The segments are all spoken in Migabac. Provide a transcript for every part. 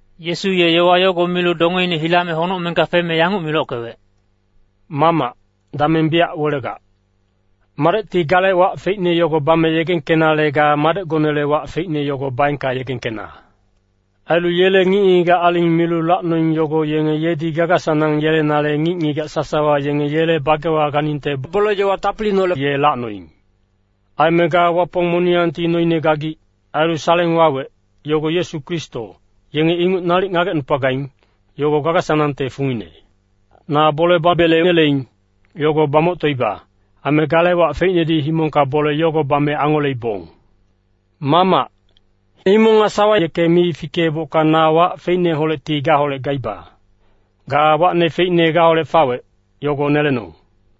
Yesu ye yowa yogo milu dongeine hilame honocmengka feme yanguc milockewec, “Mamac, dameng biyac welegac. Madecti gale wac feicne yogo bame yegengkenale ga Madecgonele wac feicne yogo baengka yegengkena. Ailu yele ngic-ngigac aling milu lacnoing yogo yenge yedi gaga-sanang yelenale ngic-ngigac sasawa yenge yele bagewa ganingte bole-yowa tapiliineholec ye lacnoing. Aime ga Wapong moniyangti noine gagic. Ailu saleng wawec, yogo Yesu Kristo, yenge inguc nalic ngagecnupagaing, yogo gaga-sanangte fungine. Na bole babele neleing, yogo bamoctoiba. Aime gale wac feicnedi himongka bole yogo bame angoleibong. Mamac, himong nga sawa yeke mi fikeebocka na wac feicneholecti gaholec gaiba, ga wacne feicne gaholec fawec, yogo nelenong.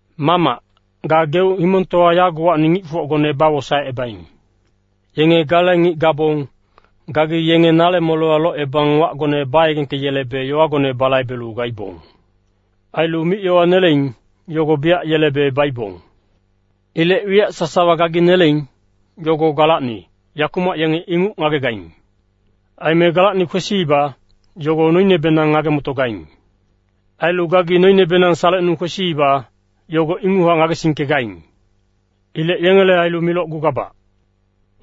“Mamac, gageuc himongtowa yagowacni ngicfocgone bawosaecebaing. Yenge gale ngic gabong, gagi yenge nale molewa locebang wacgone bayegengkeyelebe yowagone balaibelu gaibong. Ailu mic-yowa neleing, yogo biyac yelebe baibong. Ilec wiyac sasawa gagi neleing, yogo galacni, yakumac yenge inguc ngagegaing. Aime galacni kwesiiba, yogo noinebenang ngage-motogaing. Ailu gagi noinebenang salecnung kwesiiba, yogo inguchac ngagesingkegaing. “Ilec yengele ailu milocgugabac.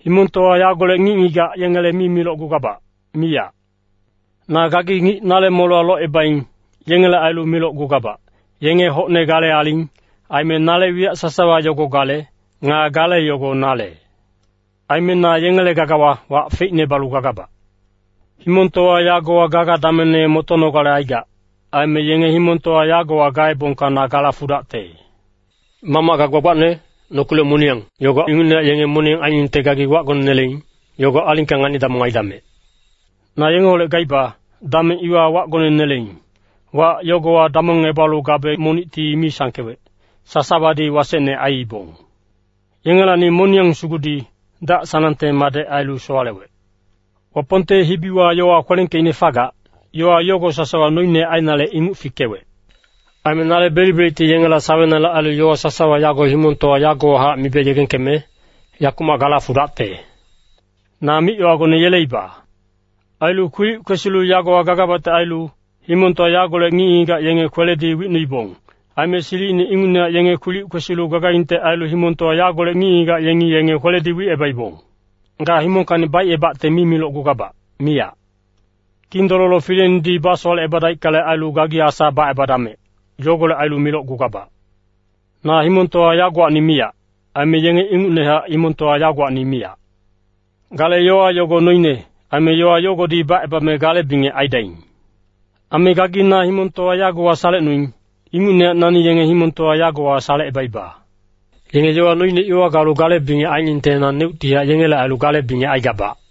Himongtowa yagolec ngic-ngigac yengele mi milocgugabac, miyac. Na gagi ngic nale molewa locebaing, yengele ailu milocgugabac, yenge hocne gale aling, aime nale wiyac sasawa yogo gale, nga gale yogo nale. Aime na yengele gagawa wac feicne balu gagabac. Himongtowa yagowa gaga damengne motonogale aigac. Aime yenge himongtowa yagowa gaebongka na gala fudacte. Mamac ga gbagbacne, nokilec moniyang, yogo ingucnehac yenge moniyang ainingte gagi wacgone neleing, yogo alingka ngani-damong aidamec. Na yengeholec gaiba, dameng iwa wacgone neleing, wac yogowa damongebalu gabe monicti mi sangkewec, sasawadi wasecne aiibong. Yengelacni moniyang sugudi, dac-sanangte madec ailu sowalewec. Wapongte hibiwa yowa kwelengkeicne fagac, yowa yogo sasawa noine ainale inguc fikewec. “Aime nale belic-belicti yengela sawenale ailu yowa sasawa yago himongtowa yagowahac mibe yegengkeme, yakumac gala fudacte. Na mic-yowagone yeleiba. Ailu kwilic kwesilu yagowa gagabacte ailu, himongtowa yagolec ngic-ngigac yenge kweledi wicnuibong. Aime silicine ingucnehac yenge kwilic kwesilu gagaingte ailu himongtowa yagolec ngic-ngigac yengi yenge kweledi wicebaibong. Ga himongkacni baicebacte mi milocgugabac, miyac. Kindololo fileinedi basowalecebadaickale ailu, gagi asa bacebadamec. Yogolec ailu milocgugabac. Na himongtowa yagowacni miyac. Aime yenge ingucnehac himongtowa yagowacni miyac. Gale yowa yogo noine, aime yowa yogodi bacebame gale bingec aidaing. Aime gagi na himongtowa yagowa salecnuing, ingucnehac nani yenge himongtowa yagowa salecebaiba. Yenge yowa noine iwa galu gale bingec ainingte naneuctihac yengele ailu gale bingec aigabac.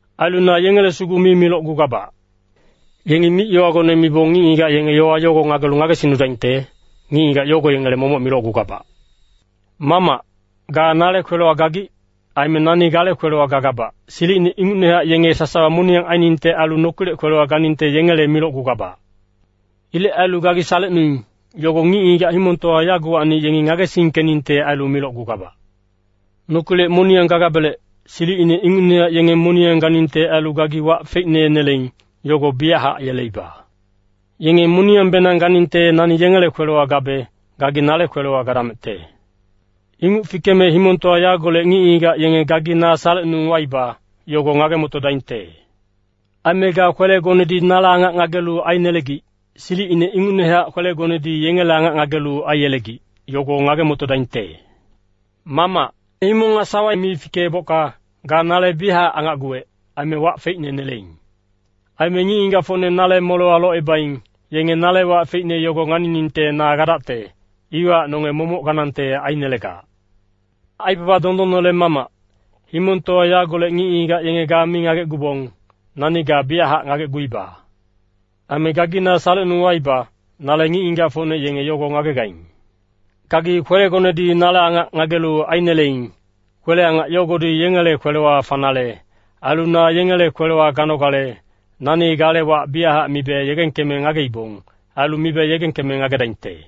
“Ailu na yengele sugu mi milocgugabac. Yengi mic-yowagone mibong ngic-ngigac yenge yowa yogo ngagelu ngagesingnudaingte, ngic-ngigac yogo yengele momoc milocgugabac. Mamac, ga nale kwelewa gagic. Aime nani gale kwelewa gagabac, silicine ingucnehac yenge sasawa moniyang ainingte ailu nokilec kwelewa ganingte yengele milocgugabac. Ilec ailu gagi salecnuing, yogo ngic-ngigac himongtowa yagowacni yengi ngagesingkeningte ailu milocgugabac. Nokilec moniyang gagabelec, silicine ingucnehac yenge moniyang ganingte ailu gagi wac feicne neleing, yogo biyachac yeleiba. Yenge moniyangbenang ganingte nani yengele kwelewa gabe, gagi nale kwelewa gadamecte. Inguc fikeme himongtowa yagolec ngic-ngigac yenge gagi na salecnung waiba, yogo ngage-motodaingte. Aime ga kwelegonedi nale angac ngagelu ainelegic, silicine ingucnehac kwelegonedi yengele angac ngagelu aiyelegic, yogo ngage-motodaingte. “Mamac, himong nga sawa mi fikeebocka, ga nale biyachac angacguwec, aime wac feicne neleing. Aime ngic-ngigacfocne nale molewa locebaing, yenge nale wac feicne yogo nganiningte na gadacte, iwahac nonge momoc ganangte ainelegac. Aibaba dondonnele Mamac, himongtowa yagolec ngic-ngigac yenge ga mi ngagecgubong, nani ga biyachac ngagecguiba. Aime gagi na salecnung waiba, nale ngic-ngigacfocne yenge yogo ngagegaing. Gagi kwelegonedi nale angac ngagelu aineleing. Kwele-angac yogodi yengele kwelewa fanale ailu na yengele kwelewa ganogale, nani gale wac biyachac mibe yegengkeme ngageibong. Ailu mibe yegengkeme ngagedaingte.”